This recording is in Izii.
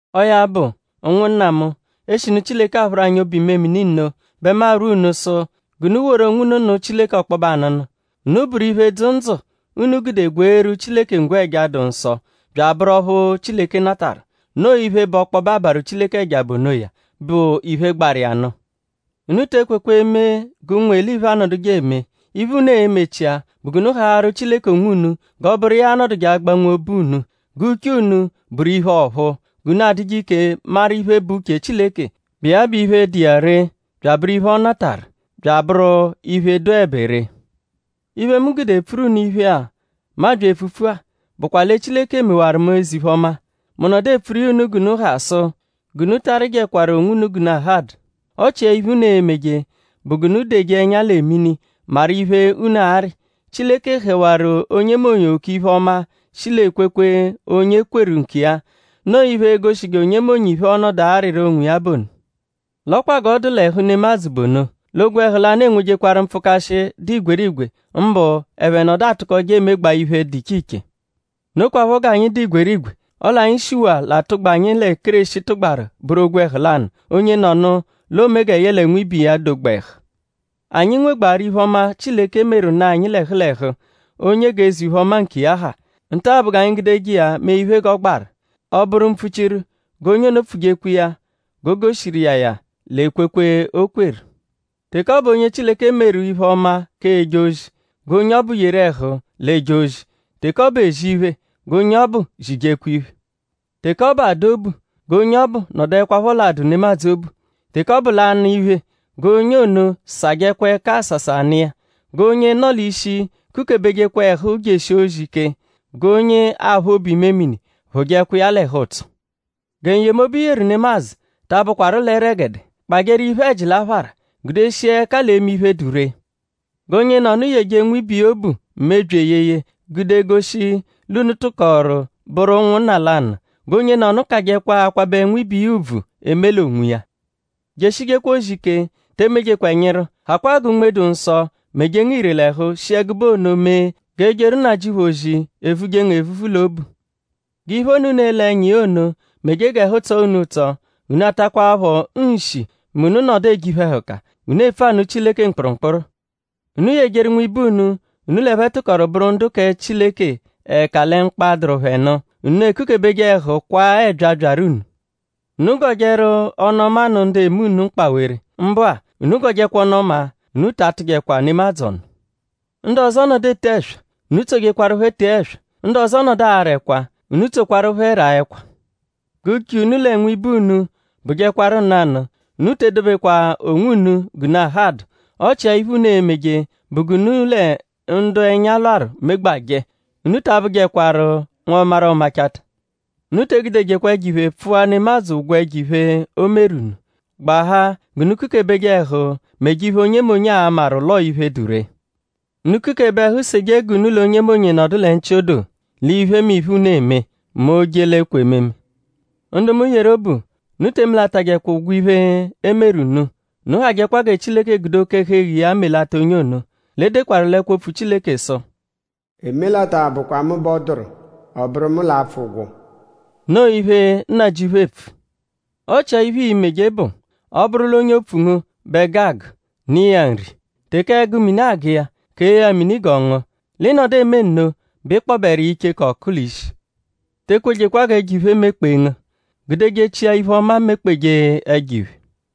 Ọo ya bụ; ụnwunna mu; eshinu Chileke aphụru anyi obu-imemini nno bẹ mu arwọ unu sụ g'unu woru onwunu nụ Chileke ọkpobe anụnu; unu bụru iphe, dzụ ndzụ, unu gude gweeru Chileke ngwẹja, dụ nsọ bya abụru ọphu Chileke natarụ. Noo iphe, bụ ọkpobe abarụ Chileke ẹja bụ onoya, bụ iphe, gbarụ iya nụ. Unu te ekwekwa eme g'ụnwu-eliphe anọduje eme. Iphe, unu e-mechia bụ g'unu haarụ Chileke onwunu g'ọ bụru iya l'a-nọduje agbanwe obu unu; g'uche unu bụru iphe ọ̀phúú g'unu a-dụje ike maru iphe, bụ uche Chileke, bụ iya bụ iphe, dụ iya ree; bụru iphe, ọ natarụ bya abụru iphe, dụebe ree. Iphe, mu gude epfuru unu iphe-a, mu abya epfupfu-a bụkwa lẹ Chileke mewaru mu eze-iphe-ọma; mu nọdu epfuru iya unu g'unu ha sụ g'unu ta arịjekwaru onwunu g'unu ahadụ. Ọ chia iphe, unu e-meje bụ g'unu deje ẹnya lẹ mini maru iphe, unu arị. Chileke hẹwaru onyemonye oke iphe-ọma, shi l'ekwekwe, onye kweru nkiya. Noo iphe, e-goshije onyemonye iphe, ọo-nọdu arịru onwiya bụ ono. L'ọ kwa g'ọ dụ l'ẹhu nemadzụ bụ ono; l'ogwẹhu lanụ enwejekwaru mpfụkashi, dụ igwerigwe; mbụ ẹphe nọdu atụkoje emegbaa iphe, dụ iche iche. Nokwaphọ g'anyi dụ igwerigwe; ọle anyi shiwaa l'atụgba, anyi lẹ Kéreshi tụgbaru bụru ogwẹhu lanụ. Onyenọnu l'oome gẹ yẹle nwibe iya dogba ẹhu. Anyi nwegbaarụ iphe-ọma, Chileke meru nụ anyi l'ẹhu l'ẹhu; onye g'eze-iphe-ọma nkiya ha. Nta-a bụ g'anyi gudeje iya mee iphe, g'ọ gbaru. Ọ bụru mpfuchiru, g'onye ono pfujekwa iya g'o goshiru iya ya l'ekwekwe, o kweru. Teke ọ bụ onye Chileke meru iphe-ọma k'eje ozi; g'onye ọbu yeru ẹhu l'eje ozi. Teke ọ bụ ezi iphe; g'onye ọbu zijekwa iphe. Teke ọ bụ adụ obu; g'onye ọbu nọduekwapho l'adụ nemadzụ obu. Teke ọ bụ l'anụ iphe; g'onye ono sajẹkwa ẹka asasa nụ iya. G'onye nọ l'ishi kukebejekwa ẹhu jeshi ozi ike; g'onye aphụ obu-imemini phụjekwa iya l'ẹhu-ụtso. Gẹ n-yemobu i yeru nemadzụ ta abụkwaru l'ẹregede. Kpajẹru iphe-ẹji l'aphara; gudeshia ẹka l'eme iphe, dụ ree. G'onyenọnu yeje nwibe iya obu mebyi eyeye gude goshi l'unu tụkoru bụru ụnwunna lanụ. G'onyenọnu kajẹkwa akwabẹ nwibe iya ùbvù eme l'onwiya. Jeshijekwa ozi ike; te emejekwa ẹnyiru. Hakwaa gẹ Unme-dụ-Nsọ meje ngu ire l'ẹhu; shi ẹgube ono mee g'ejeru Nnajịuphu ozi e-vuje ngu evuvu l'obu. G'iphe ono, unu ele ẹnya iya ono meje g'ẹhu tsọ unu ụtso. Unu atakwaphọ nshi mẹ unu -nọdu eje iphe-ẹhuka. Unu epfu anụ Chileke mkpụrumkpuru. Unu yejeru nwibe unu, unu l'ẹphe tụkoru bụru ndu kẹ Chileke ẹka lẹ mkpa, dụru phẹ nụ. Unu ekukebeje ẹhu kwaa ẹbyaa, byaru unu. Unu gọjeru ọnu-ọma nụ ndu eme unu mkpawere. Mbụ-a unu gọjekwa ọnu-ọma; unu ta atụjekwa nemadzụ ọnu. Ndu ọzo -nọdu ete ẹswa; unu tsojekwarụ phẹ tee ẹswa; ndu ọzo -nọdu ara ẹkwa; unu tsokwaru phẹ raa ẹkwa. G'uche unu lẹ nwibe unu bụjekwaru nanụ. Unu te edobejekwa onwunu g'unu ahadụ. Ọ chia iphe, unu e-meje bụ g'unu lẹ ndu ẹnya lwarụ megbajẹ. Unu ta abụjekwaru nwọmaru-ọ-machata. Unu te egudejekwa ẹjo-iphe pfụa nemadzụ ụgwo ẹjo-iphe, o meru unu; gbahaa g'unu kukebeje ẹhu meje iphe, onyemonye a-maru l'ọo iphe, dụ ree. Unu kukebe ẹhu seje g'unu l'onyemonye nọdu lẹ nchị-odoo; l'iphemiphe, unu eme; mẹ oo-je l'ekwe ememe. Ndu mu yeru obu; unu te emelatajẹkwa ụgwo iphe, e meru unu. Unu hajẹkwa gẹ Chileke gude oke-ẹhu-eghu iya melata onye ono. L'e dekwaru l'ẹkwo-opfu Chileke sụ: “Emelata bụkwa mu bẹ ọ dụru; ọ bụru mu l'a-pfụ ụgwo.” Noo iphe, Nnajịuphu eepfu. Ọ chia iphe ii-meje bụ: “Ọ -bụru l'onye opfu ngu bẹ ẹgu agụ; nụ iya nri. Teke ẹgu mini agụ iya; kee ya mini g'ọ ngụa; lẹ ị -nọdu eme nno bẹ ị kpọberu iya icheku-ọku l'ishi.” Te ekwejekwa g'ẹjo-iphe mekpee ngu; gudejechia iphe-ọma mekpeje ẹjo-iphe.